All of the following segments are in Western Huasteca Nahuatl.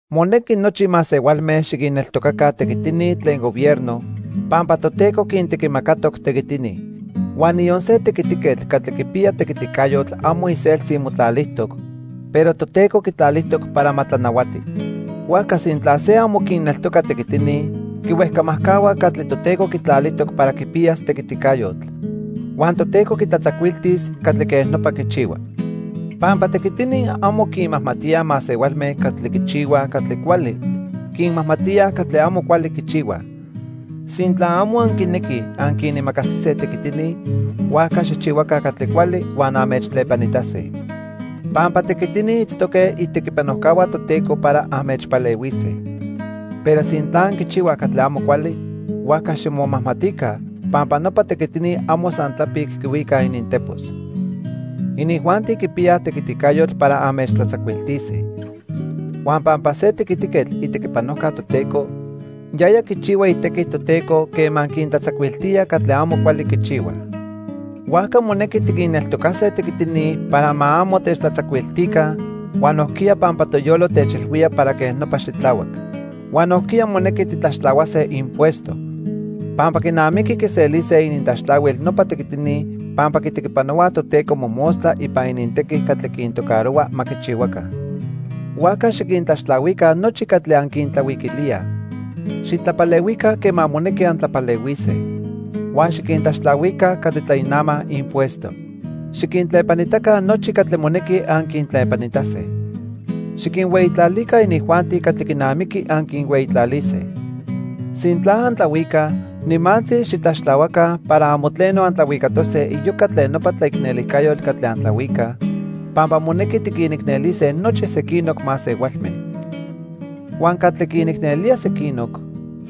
Monequi nochi masehualme xiquinneltocaca tequitini tlen gobierno, pampa Toteco quintequimacatoc tequitini. Huan niyon se tequitiquetl catli quipiya tequiticayotl amo iseltzi motlalijtoc, pero Toteco quitlalijtoc para ma tlanahuati. Huajca sintla se amo quinneltoca tequitini, quihuejcamajcahua catli Toteco quitlalijtoc para quipiyas tequiticayotl. Huan Toteco quitlatzacuiltis catli quej nopa quichihua. Pampa tequitini amo quinmajmatíaj masehualme catli quichihuaj catli cuali, quinmajmatíaj catli amo cuali quichihuaj. Sintla amo anquinequij anquinimacasise tequitini, huajca xijchihuaca catli cuali huan anmechtlepanitase. Pampa tequitini itztoque itequipanojcahua Toteco para anmechpalehuise. Pero sintla anquichihuaj catli amo cuali, huajca ximomajmatica pampa nopa tequitini amo san tlapic quihuicaj inintepos. Inijuanti quipiyaj tequiticayotl para anmechtlatzacuiltise. Huan pampa se tequitiquetl itequipanojca Toteco, yaya quichihua itequi Toteco quema quintlatzacuiltía catli amo cuali quichihuaj. Huajca monequi tiquinneltocase tequitini para ma amo techtlatzacuiltica huan nojquiya pampa toyolo techilhuía para quej nopa xitlahuac. Huan nojquiya monequi titlaxtlahuase impuesto. Pampa quinamiqui quiselise inintlaxtlahuil nopa tequitini pampa quitequipanohuaj Toteco mojmostla ipan inintequi catli quintocarohua ma quichihuaca. Huajca xiquintlaxtlahuica nochi catli anquintlahuiquilíaj. Xitlapalehuica quema monequi antlapalehuise. Huan xiquintlaxtlahuica catli tlainamaj impuesto. Xiquintlepanitaca nochi catli monequi anquintlepanitase. Xiquinhueyitlalica inijuanti catli quinamiqui anquinhueyitlalise. Sintla antlahuicaj, nimantzi xitlaxtlahuaca para amo tleno antlahuicatose iyoca tlen nopa tlaicnelijcayotl catli antlahuicaj, pampa monequi tiquinicnelise nochi sequinoc masehualme. Huan catli quinicnelía sequinoc,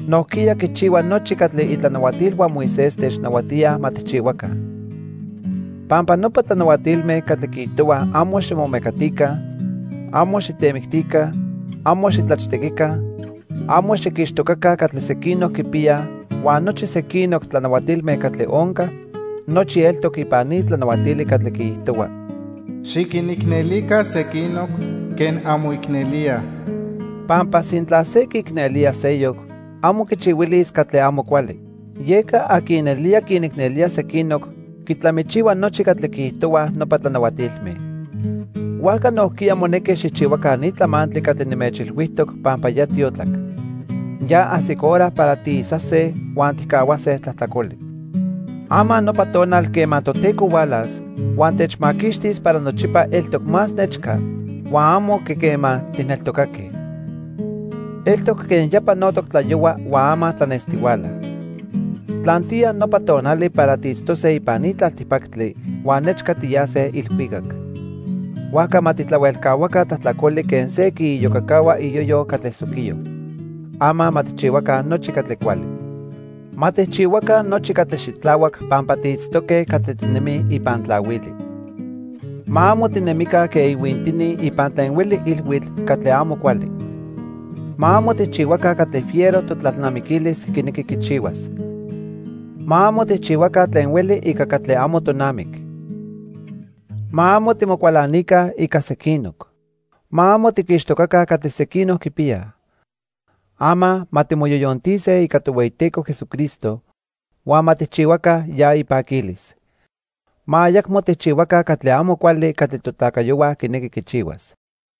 nojquiya quichihua nochi catli itlanahuatilhua Moisés technahuatíaj ma tijchihuaca. Pampa nopa tlanahuatilme catli quiijtohuaj amo ximomecatica, amo xitemictica, amo xitlachtequica, amo xiquixtocaca catli sequinoc quipiyaj huan nochi sequinoc tlanahuatilme catli onca, nochi eltoc ipan ni tlanahuatili catli quiijtohua: "Xiquinicnelica sequinoc quen anmoicnelíaj." Pampa sintla se quiicnelía seyoc, amo quichihuilis catli amo cuali. Yeca aqui nelía quinicnelía sequinoc quitlamichihua nochi catli quiijtohuaj nopa tlanahuatilme. Huajca nojquiya monequi xijchihuaca ni tlamantli catli nimechilhuijtoc pampa ya tiotlac. Ya ajsic hora para tiisase huan tijcahuase tlajtlacoli. Ama nopa tonal quema Toteco hualas huan techmaquixtis para nochipa eltoc más nechca huan amo quen quema tijneltocaque. Eltoc quen ya panotoc tlayohua huan ama tlanestihuala. Tlantiya nopa tonali para tiitztose ipan ni tlaltipactli huan nechca tiyase ilhuicac. Huajca ma tijtlahuelcahuaca tlajtlacoli quen se quiiyocacahua iyoyo catli soquiyo. Ama ma tijchihuaca nochi catli cuali. Ma tijchihuaca nochi catli xitlahuac pampa tiitztoque catli tinemij ipan tlahuili. Ma amo tinemica quen ihuintini ipan tlen hueli ilhuitl catli amo cuali. Ma amo tijchihuaca catli fiero totlalnamiquilis quinequi quichihuas. Ma amo tijchihuaca tlen hueli ica catli amo tonamic. Ma amo timocualanica ica sequinoc. Ma amo tiquixtocaca catli sequinoc quipiyaj. Ama ma timoyoyontise ica Tohueyiteco Jesucristo, huan ma tijchihuaca ya ipaquilis. Ma ayacmo tijchihuaca catli amo cuali catli totlacayohua quinequi quichihuas.